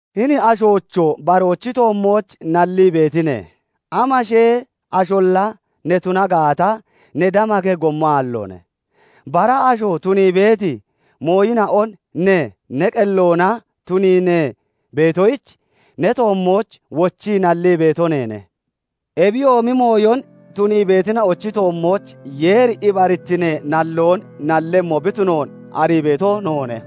Hini ashoocho! Baroochi toommooch nallii beetine? Amashee asholla ne tuna gaata, ne damakemmi gommo aalloone. Bara asho tunii beeti mooyina'on ne, ne qelloona tunii ne beetoyich, ne toommooch wochii nallii beeto neene. Ebiyoomi mooyon tunii beetina'ochi toommooch Yeeri ibarittinee nalloon nallemmo bi tunoon arii beeto noone.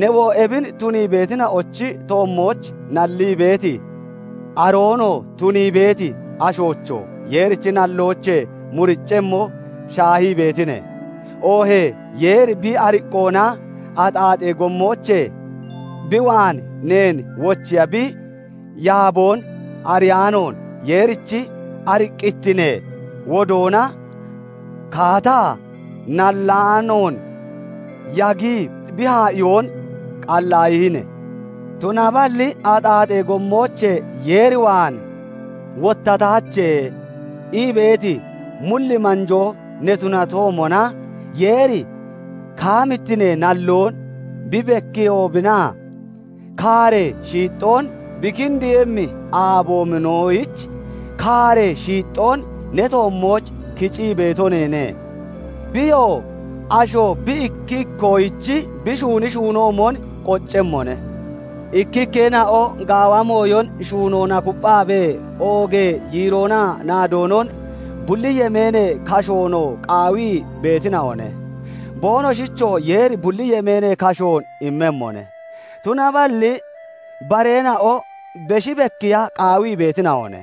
Newoo ebin tunii beetina'ochi toommooch nallii beeti, aroonoo tunii beeti ashoocho! Yeerichi nalloochee muriccemmo shaahii beetine? Oohee Yeeri bi ariqqoona axaaxee gommoochee bi waan neen wochiya bi yaaboon ariyaanoon, Yeerichi ariqqittinee woddoonaa kaataa nallaanoon yagii bi haa'iyoonon qallaayinne? Tunaballi "Axaaxee gommoochee Yeer waan wottataache" ii beeti mulli manjoo ne tunatoomona, Yeeri kaamittinee nalloon bi bekkiiyehoobinaa kaaree shiixxoon bi kindiiyemmi aaboobinoyich kaaree shiixxoon ne toommooch kicii beeto neene. Biyoo asho bi ikki ikkoyich bi shuuni shuunoomon qoccemmone. Ikkikkeena'o gaawa mooyon shuunoona kupphaabee oogee yiiroonaa naadoonon, bulli yemeenee kashoonoo qaawii beetina'one; boonoshichoo Yeeri bulli yemeenee kashoon immemmone. Tunaballi bareena'o beshi bekkiya qaawii beetina'one;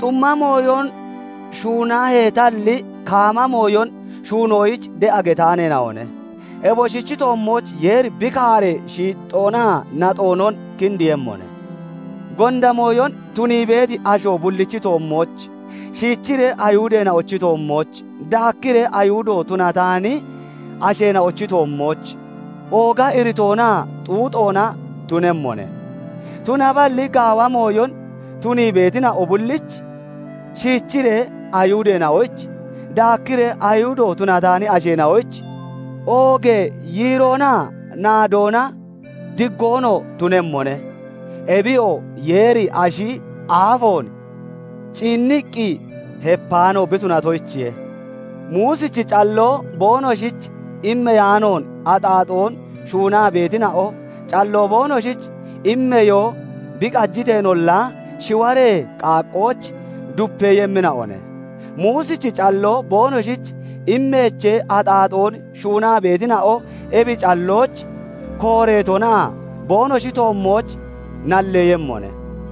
xumma mooyon shuunaheetalli, kaama mooyon shuunoyich de'a getaaneena'one; eboshichi toommooch Yeeri bi kaaree shiixxoonaa naxoonon kindiiyemmone. Gonda mooyon tunii beeti asho bullichi toommooch, shiichiree Ayihudeena'ochi toommooch, daakkiree Ayihudo tunataani asheena'ochi toommooch, ooga iritoonaa xuuxoona tunemmone; tunaballi gaawa mooyon tunii beetina'o bullich, shiichiree Ayihudeena'oyich, daakkiree Ayihudo tunataani asheena'oyich, oogee yiiroonaa naadoona, diggoonoo tunemmone. Ebiyoo Yeeri ashi aafoon ciinniqqi hepaano bi tunatoyichiye. Muusichi calloo boonoshich immeyaanoon axaaxoon shuunaa beetina'o, calloo boonoshich immeyoo bi qajiteenolla, shiwaree qaaqqooch dupeeyemmina'one; Muusichi calloo boonoshich immeechee axaaxoon shuunaa beetina'o ebi callooch kooreetona boonoshi toommooch nalleeyemmone.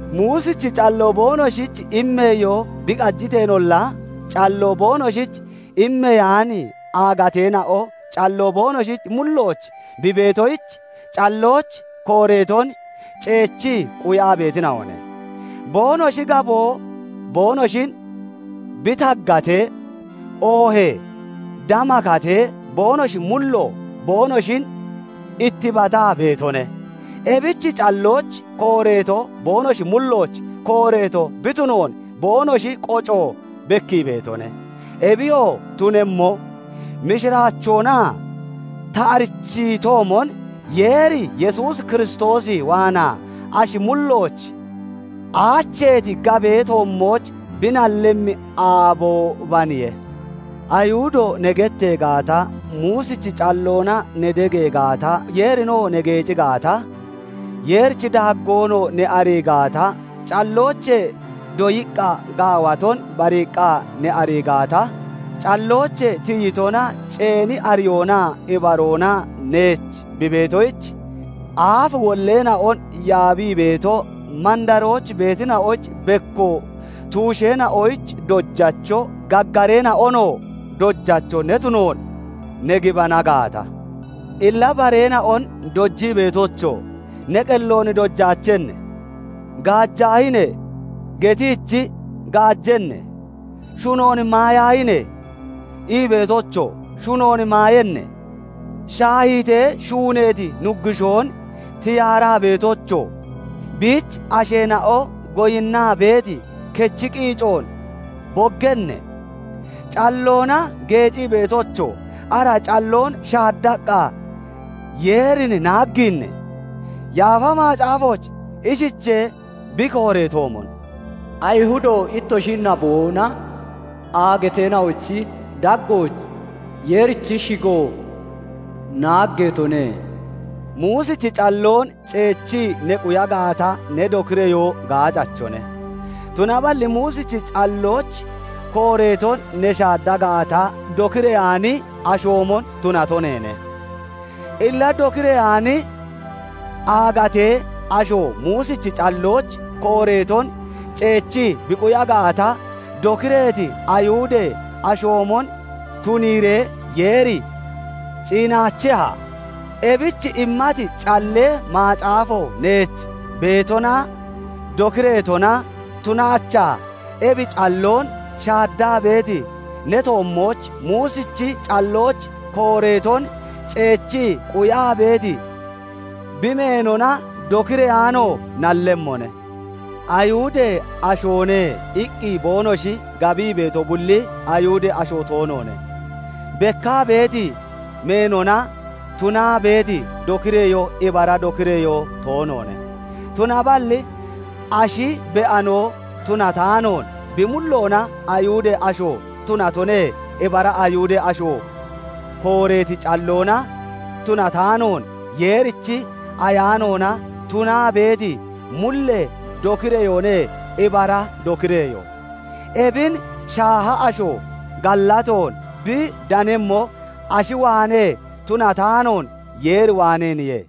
Muusichi calloo boonoshich immeyoo bi qajiteenolla, calloo boonoshich immeyaani aagateena'o calloo boonoshi mullooch bi beetoyich, callooch kooreeton ceechii quyaa beetina'one. Boonoshi gaboo boonoshin bi taggatee, oohee damakatee, boonoshi mullo boonoshin ittibataa beetone. Ebich callooch kooreeto boonoshi mullooch kooreeto bi tunoon boonoshi qoco bekkii beetone. Ebiyoo tunemmo, mishiraachoona ta arichiitoomon Yeeri Yesuus Kiristoos waanaa ashi mullooch aacheeti gabee toommooch bi nallemmi aaboobaniye. Ayihudo ne gettee gaata, Muusichi calloona ne degee gaata, Yeerinoo ne geeci gaata, Yeerichi daaggoonoo ne arii gaata, calloochee doyiqqa gaawaton bariiqqa ne arii gaata, calloochee tiyitona ceeni ariyoonaa ibaroona neech bi beetoyich, aaf wolleena'on yaabii beeto, mandarooch beetina'oyich bekko, tuusheena'oyich dojacho, gaggareena'onoo dojacho ne tunoon ne gibana gaata, illa bareena'on dojii beetocho! Ne qelloon dojaachenne? "Gaajaahine!" getiichi, gaajenne? "Shunoon maayaahine!" ii beetocho! Shunoon maayenne? Shaahiitee shuuneeti nuggushoon tiyaaraa beetocho! Biich asheena'o goyinnaa beeti kechi qiicoon boggenne? Calloona geecii beetocho! Ara calloon shaaddaqqa Yeerin naaggiinne? Yaafa Macaafooch ishichee bi kooreetoomon, "Ayihudo ittoshi naboona aagateena'ochi daggooch Yeerichi shigo naaggeetone." Muusichi calloon ceechii ne quya gaata, ne dokireyoo gaacachone; tunaballi Muusichi callooch kooreeton ne shaadda gaata, dokireyaani ashoomon tunato neene. Illa dokireyaani aagatee asho Muusichi callooch kooreeton ceechii bi quya gaata, dokireeti Ayihudee ashoomon tuniiree Yeeri ciinaacheha? Ebich immati Callee Macaafo neech beetonaa dokireetona tunaachaa ebi calloon shaaddaa beeti ne toommooch Muusichi callooch kooreeton ceechii quyaa beeti, bi meenona dokireyaano nallemmone. "Ayihudee ashoone" iqqi boonoshi gabii beeto bulli Ayihudee asho toonoone; bekkaa beeti meenona tunaa beeti dokireyoo ibara dokireyoo toonoone; tunaballi ashi be'ano tunataanoon, bi mulloona Ayihudee asho tunatone ibara Ayihudee asho; kooreeti calloona tunataanoon, Yeerichi Ayaanoona tunaa beeti mullee dokireyoone ibara dokireyoo. Ebin shaaha asho gallatoon bi danemmo ashi waanee tunataanoon, Yeer waaneeniye.